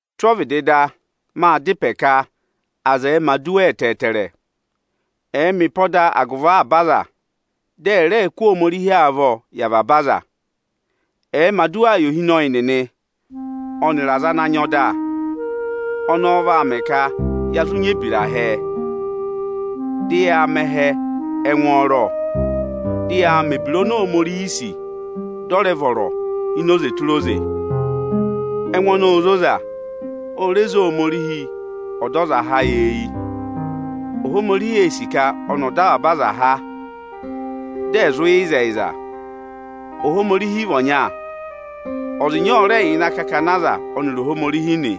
Tụ́ ọvịdị da, maa dá ịpẹ ka aza ẹ̀ẹ mẹ̀ aduwa ẹtẹẹtẹrẹ, ẹ̀ẹ mẹ ịpọda agụvị avaba aza, dị ẹ̀ rẹẹ kụ́ Ohomorihi avọọ yị avaba aza! Ẹ̀ẹ mẹ̀ aduwaa yị ohinọyị nịnị ọnịrị aza ana nyị ọda! Ọnọọ vaa mẹ ka ya zụ nyị ebira hẹẹ, dị yaa mẹ ẹhẹ ẹngwọọrọ, dị yaa mẹ mẹ̀ ebira oni Ohomorihi sì dị ọ rẹ vọrọ ini oze tụra oze. Ẹngụ ọnọọ óo zoza, o re zé Ohomorihi Ọdọzaha ayị eyi. Ohomorihi ee sì ka ọnị ọ̀ dọ avaba aza há, dị ẹ̀ zụ yẹ ịzẹyịza. Ohomorihi vị ọnya. Ọza ịnya ọ rẹ yà ịnị akakana aza ọnịrị Ohomorihi nị;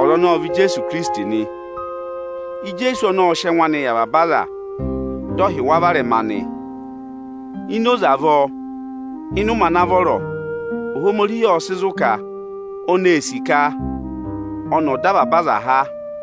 ọza ọnọọ ọ vị Ijeesu Ikirisiti nị. Ijeesu ọnọọ ọ sị ẹngụ anị yị avaba aza, dị ọ hị́ wa varẹma nị. Ini oze avọọ, ịnị ụmẹ ana vọrọ, Ohomorihi ộ sị zụ̀ ka oni ee sì ka ọnị ọ̀ dọ avaba aza há.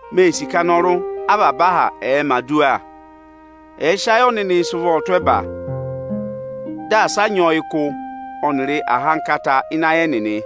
Mee sì ka avaba aha anọrụ ẹ̀ẹ mẹ̀ aduwa; ẹ̀ sị ayị ọnịnị sị ụvọ tụ́ ẹba, dị asị a nyị ọyịkụ ọnịrị ahankata ịnị ayị ẹnịnị!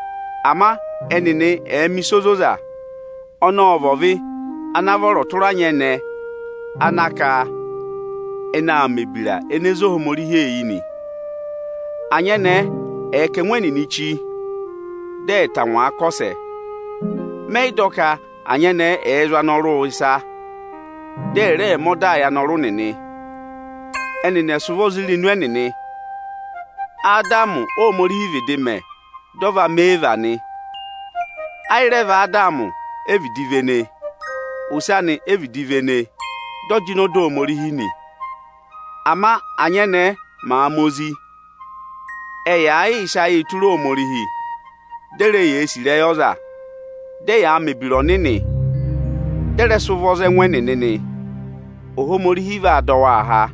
Ama ẹnịnị ẹ̀ẹ mẹ̀ ịsa ozoza; ọnọọ ọ vị ọvị ana vọrọ tụra anyẹnẹẹ ana ka ẹnị aa mẹ̀ ebira ene zé Ohomorihi eyi nị. Anyẹnẹẹ ẹ̀ kà ẹngụ ẹnịnị chí, dị ẹ̀ tangwaa kọsẹ! Mẹ yị dọ ka anyẹnẹẹ ẹẹ zụ̀ anọrụụ ịsa, dị ẹ̀ rẹẹ mẹ ọdaa yị anọrụ nịnị. Ẹnịnị ẹ̀ sị ụvọ za irenu ẹnịnị! Adamị Óhomorihi vịdị mẹ, dị ọ va mẹ Iivi nị. Ayị rẹ vị Adamị e vịdị vene, ose anị e vịdị vene, dị ọ jịnẹ ọda Ohomorihi nị. Ama ányẹnẹẹ màa ma ozi, ẹ̀ẹ yaa yịị sị ayịị tụra Ohomorihi, dị e re yee sì ịrẹyị ọza, dị ẹyaa mẹ̀ ebira ọnịnị dị ẹ rẹ sị ụvọ za ẹngụ ẹnịnị nị, Ohomorihi vaa dọ waa há.